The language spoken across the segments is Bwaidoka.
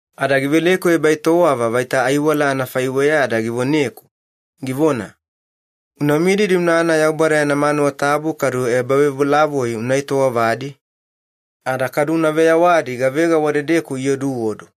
Ada giveleku ebaetowava vaita aiwala anafaiweya ada givoneku, givona, “Una mididi unana Yaubada yana manuwa tabu kadu ebavebolavoi una etowavadi, ada kadu una veyawadi gavega wadedeku ioduodu.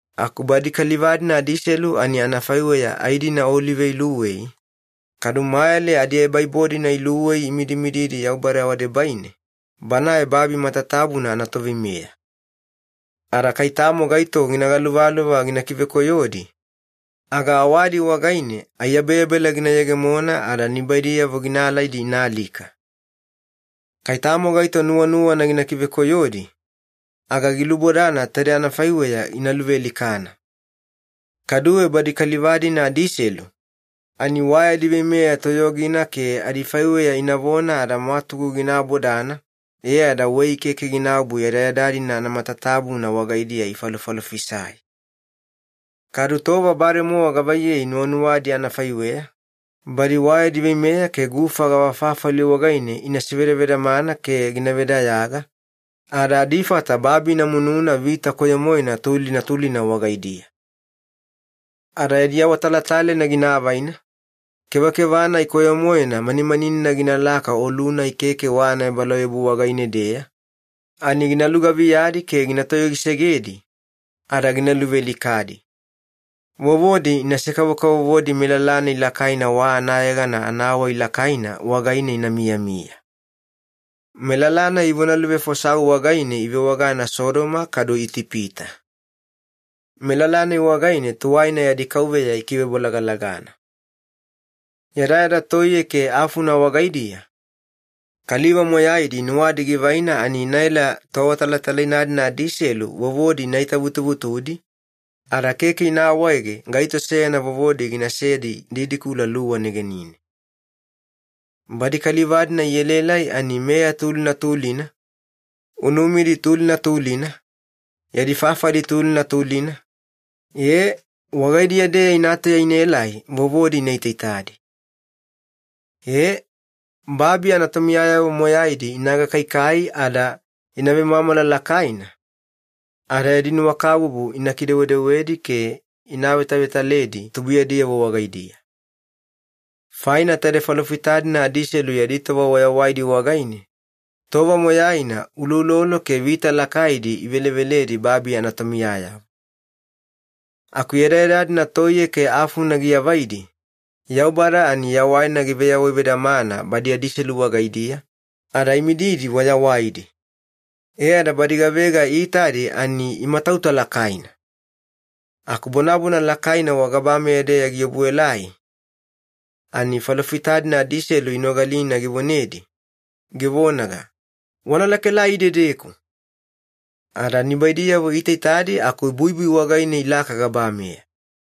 Aku badi kaliva-dina adiselu ani anafaiweya ai-dina olive iluwei, kadu mayale adiebaibo-dina iluwei imidimididi Yaubada wadebaine, Banae babi matatabuna anaToveimeya. Ada kai tamo gaito gina galuvaluva gina kivekoyodi, aga awadi wagaine aiyabeyabela gina yegemona ada nibaidiyavo gina alaidi ina alika. Kai tamo gaito nuwanuwana gina kivekoyodi, aga gilubodana taide anafaiweya ina luvealikana. Kaduwe badi kaliva-dina adiselu, ani wa yadi veimeya toyogina ke adifaiweya inavona ada mwatugu gina abodana, e ada wei keke ginaobu yadayada-dina anamatatabuna wagaidiya ifalofalofisai. Kadu tova bademowa gavaiyei nuwanuwadi anafaiweya, badi wa yadi veimeya ke gufa gavafafali wagaine ina sevadavedamana ke gina vedayaga, ada adifata babi ina mununa vita koyo-moena tulina tulina wagaidiya. Ada yadi awatalatalaina gina avaina, kevakeva-nai koyo-moena manimaninina ginalaka olu-nai keke wa anaebalauyabu wagaine-deya, ani gina lugaviyadi ke gina toyogisegedi, ada gina luvealikadi. Vovodi inase-kavovodi melala-nai lakaina wa anayegana anawai lakaina wagaine ina miyamiya. Melala-nai ivonaluvefosau wagaine ivewagana Sodoma kadu Itipita. Melala-nai wagaine tuwaina yadi Kauveya ikivebolagalagana. Yadayada toiye ke afuna wagaidiya, kaliva moyaidi nuwadi givaina ani inaela toawatalatalaina-dina adiselu vovodi ina itavutuvutudi, ada keke ina awaege gaito seyana vovodi ginasedi didikula luwa negenine. Badi kaliva-dina ielaelai ani meya tulina tulina, unumidi tulina tulina, yadi fafali tulina tulina, ee wagaidiya-deya ina tauya inaelai vovodi ina itaitadi. Ee, babi anatomiyayavo moyaidi ina gakaikai ada ina vemwamwala lakaina, ada yadi nuwakabubu ina kidewedewedi ke ina avetavetaledi tubuiyadiyavo wagaidiya. Faina taide falofita-dina adiselu yadi tova wayawaidi wagaine, tova moyaina uloulolo ke vita lakaidi iveleveledi babi anatomiyayavo. Aku yadayada-dina toiye ke afuna giavaidi, Yaubada ani yawaina giveyawaivedamana badi adiselu wagaidiya, ada imididi wayawaidi. E ada badi gavega iitadi ani imatauta lakaina. Aku bonabona lakaina wagabameya-deya giobuelai, ani falofita-dina adiselu inogalina givonedi, givonaga, “Wana lakaelai idedeku!” Ada nibaidiyavo iitaitadi aku buibui wagaine ilaka gabameya.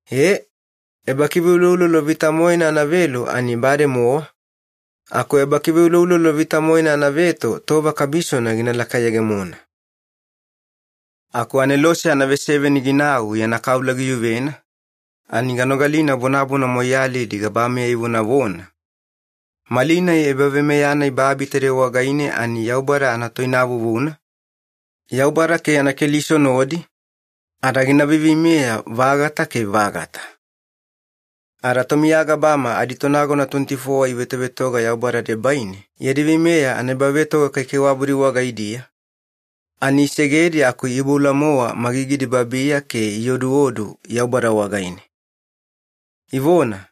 Ee, ebakiveuloulolo vita-moena anavelu ani bademowa, aku ebakiveuloulolo vita-moena anaveto tova kabisona gina lakayegemona. Aku anelose anaveseveni ginau yana kaula giyuvena, ani ganogalina bonabona moiyalidi gabameya ivonavona, “Malinai ebaveimeya-nai babi taide wagaine ani Yaubada anatoinavuvuna, Yaubada ke yana Keliso nodi, ada gina veiveimeya-vagata ke vagata.” Ada tomiya gabama aditonagona tuweniti-fowa ivetovetoga Yaubada debaine yadi veimeya anaebavetoga kaikaiwabudi wagaidiya, ani isegedi aku iiboula-mowa magigidi babiya ke ioduodu Yaubada wagaine. Ivona,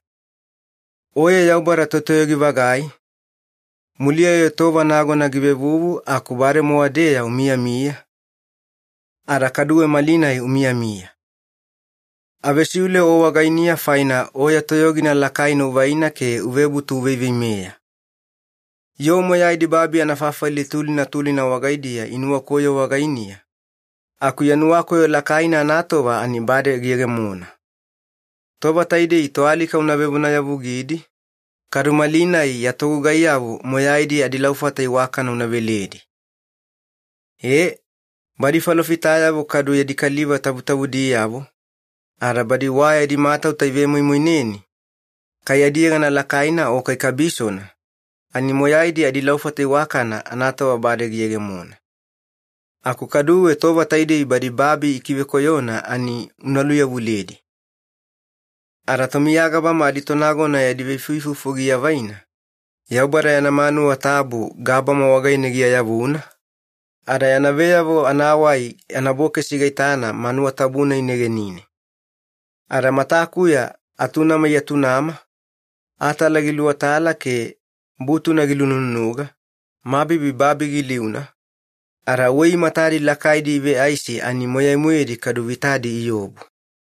“Oye Yaubada Totoyogi-vagai, muliya-yo tova nagona givevuvu aku bademowa-deya umiyamiya, ada kaduwe malinai umiyamiya. Avesiule O wagainiya faina O ya toyogina lakaina uvaina ke uvebutu uveiveimeya. Yoo moyaidi babi anafafali tulina tulina wagaidiya inuwakoyo wagainiya, aku ya nuwakoyo lakaina anatova ani bade giyegemona. Tova taidei toalika una vevonayavugidi, kadu malinai ya togugaiyavo moyaidi adilaufata iwakana una veledi. Ee, badi falofitayavo kadu ya kaliva tabutabudiyavo, ada badi wa yadi matauta ivemoimoineni, kai adiyegana lakaina o kai kabisona, ani moyaidi adilaufata iwakana anatova bade giyegemona. Aku kaduwe tova taidei badi babi ikivekoyona ani una luyavuledi.” Ada tomiya gabama aditonagona yadi veifuifufu giavaina, Yaubada yana manuwa tabu gabama wagaine giayavuna, ada yana veyavo anawai anabokesi gaitana manuwa tabu-nai negenine. Ada matakuya atunama iatunama, atala giluwatala ke butuna gilunununuga, mabibi babi giliuna, ada wei matadi lakaidi iveaisi ani moyai-moedi kadu vitadi iobu.